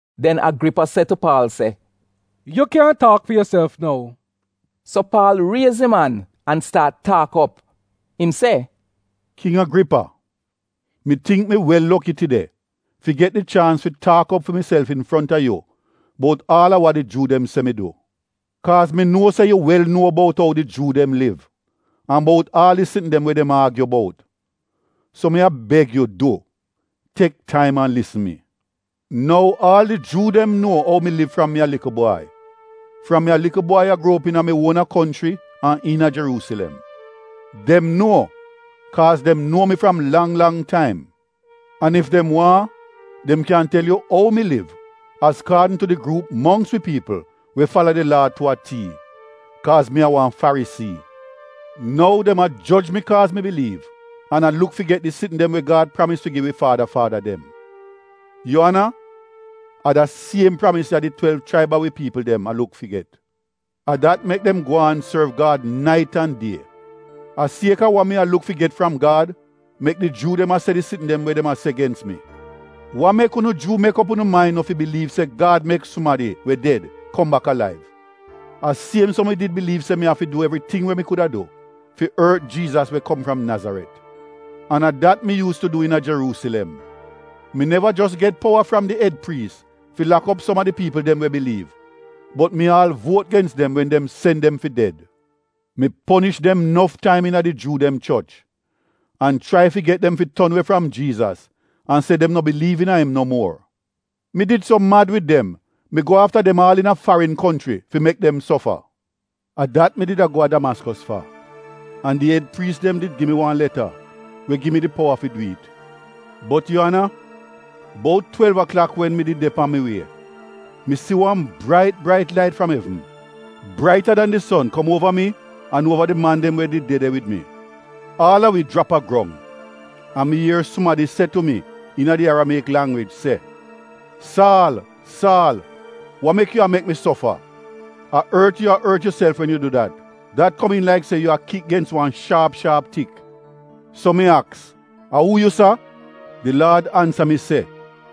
Den Agripa se tu Paal, “Yu kyan taak fi yuself nou.” So Paal ries im an an staat taak op. Im se, “King Agripa, mi tingk mi wel loki tide fi get di chaans fi taak op fi miself infronta yu bout aal a wa di Juu dem se mi du, kaaz mi nuo se yu wel nuo bout ou di Juu dem liv an bout aal di sitn dem we dem aagyu bout. So mi a beg yu du, tek taim an lisn mi. “Nou aal di Juu nuo ou mi liv fram mi a likl bwai — fram mi a likl bwai a gruo op iina mi uona konchri an iina Jeruusilem. Dem nuo, kaaz dem nuo mi fram lang lang taim. An ef dem waahn dem kyan tel yu ou mi liv azkaadn tu di gruup mongks wi piipl we fala di Laa tu a tii, kaaz mi a wan Farisii. Nou dem a joj mi kaaz mi biliiv an an a luk fi get di sitn dem we Gad pramis fi gi wi faada faada dem. Yu ana, a da siem pramis ya di twelv chraib a wi piipl dem a luk fi get. A dat mek dem gwaan sorv Gad nait an die. A sieka wa mi a luk fi get fram Gad mek di Juu dem a se di sitn dem we dem a se gens mi. Wa mek unu Juu mek op unu main no fi biliiv se Gad mek sumadi we ded kom bak alaiv? “A siem so mi did biliiv se mi did afi du evriting we mi kuda du fi ort Jiizas we kom fram Nazaret. An a dat mi yuus tu du iina Jeruusilem. Mi neva jos get powa fram di ed priis fi lak op som a di piipl dem we biliiv, bot mi aal vuot gens dem wen dem sen dem fi ded. Mi ponish dem nof taim iina di Juu dem choch an chrai fi get dem fi ton we fram Jiizas an se dem no biliiv iina im no muor. Mi did so mad wid dem mi go afta dem aal iina farin konchri fi mek dem sofa. “A dat mi did a go a Damaskos fa, an di ed priis dem did gi mi wan leta we gi mi di powa fi dwi'it. Bot yu ana, bout twelv aklak wen mi did de pan wi wie, mi si wan brait brait lait fram evn, braita dan di son kom uova mi an uova did man dem we did de de wid mi. Aal a wi jrap a grong, an mi ier sumadi se tu mi iina di Aramieyik langwij se, ‘Saal, Saal, wa mek yu a mek mi sofa? A ort yu a ort yuself wen yu du dat. Dat komiin laik se yu a kik gens wan shaap shaap tik.’ “So mi aks ‘A uu yu, Laad?’ Di Laad ansa mi se,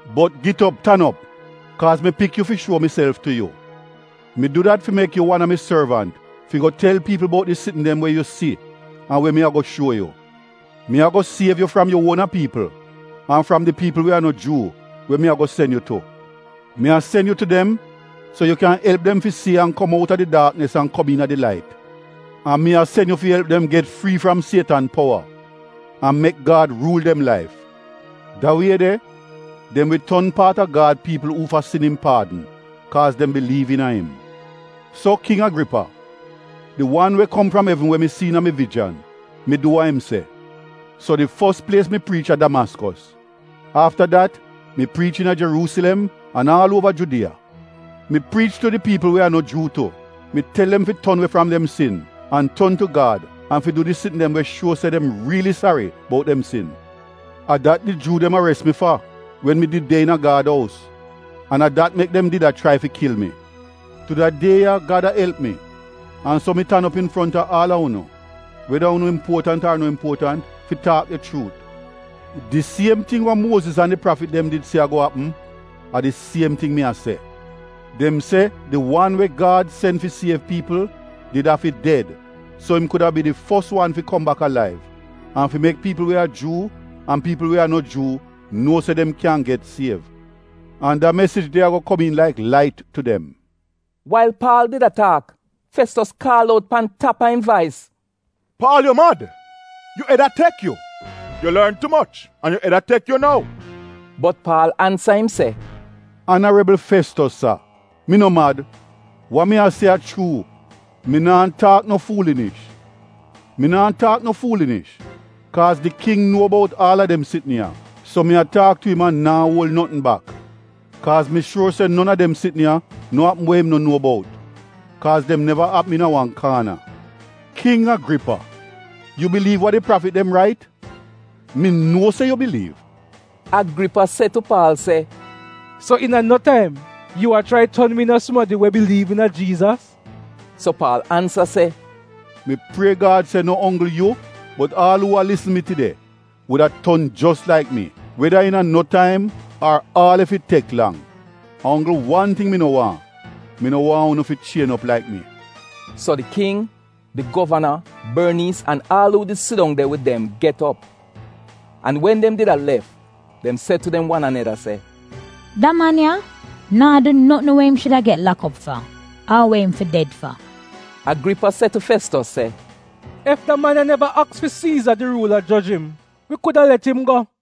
Bot git op tan op kaaz mi pik yu fi shuo miself tu yu. Mi du dat fi mek yu wan a mi sorvant fi go tel piipl bout di sitn dem we yu si an we mi ago shuo yu. Mi ago siev yu fram yu uona piipl an fram di piipl we a no Juu, we mi ago sen yu tu. Mi a sen yu tu dem so yu kyan elp dem fi si an kom outa di daaknis an kom iina di lait. An mi a sen yu fi elp dem get frii fram Sietan powa an mek Gad ruul dem laif. Da wie de dem wi ton paat a Gad piipl uufa sin im paadn kaaz dem biliiv iina im.’ “So King Agripa, di wan we kom fram evn we mi si iina mi vijan, mi du wa im se. So di fos plies mi priich a Damaskos. Afta dat mi priich iina Jeruusilem an aal uova Judiya. Mi priich tu di piipl we a no Juu tu. Mi tel dem fi ton we fram dem sin an ton tu Gad an fi du di sitn dem we shuo se dem riili sari bout dem sin. A dat di Juu dem ares mi fa wen mi did de iina Gad ous an a dat mek dem did a chrai fi kil mi. Tu da die ya Gad a elp mi an so mi tan op infronta aal a unu, weda unu impuotant ar no impuotant fi taak di chuut. Di siem ting wa Muoziz an di prafit dem did se ago apm, a di siem ting mi a se. Dem se di wan we Gad sen fi siev piipl did afi ded so im kuda bi di fos wan fi kom bak alaiv an fi mek piipl we a Juu an piipl we a no Juu nuo se dem kyan get siev, an da mesij de ago komiin laik lait tu dem.” Wail Paal did a taak, Festos kaal out pan tap a im vais, “Paal, yu mad. Yu ed a tek yu! Yu lorn tu moch an yu ed a tek yu nou!” Bot Paal ansa im se, “Anarebl Festos sa, mi no mad. Wa mi a se a chuu, mi naa taak no fuulinish. Mi naa taak no fuulinish, kaaz di King nuo bout aal a dem sitn ya, so mi a taak tu im an naa uol notn bak, kaaz mi shuor se non a dem sitn ya no apm we im no nuo bout, kaaz dem neva apm iina wan kaana. King Agripa, yu biliiv wa di prafit dem rait? Mi nuo se yu biliiv.” Agripa se tu Paal, “So iina no taim yu a chrai ton mi iina sumadi we biliiv iina Jiizas?” So Paal ansa se, “Mi prie Gad se no onggl yu bot aal uu a lisn mi tide wuda ton jos laik mi, weda iina no taim ar aal ef it tek lang. A onggl wan ting mi no waahn, mi no waahn unu fi chien op laik mi.” So di King, di govana, Borniis an aal uu did sidong de wid dem get op, an wen dem did a lef dem se tu dem wan aneda, “Da man ya naa du notn we im shuda get lak op fa, ar we im fi ded fa.” Agripa se tu Festos se, “Ef da man ya neva aks fi Siiza di ruula joj im, wi kuda let im go.”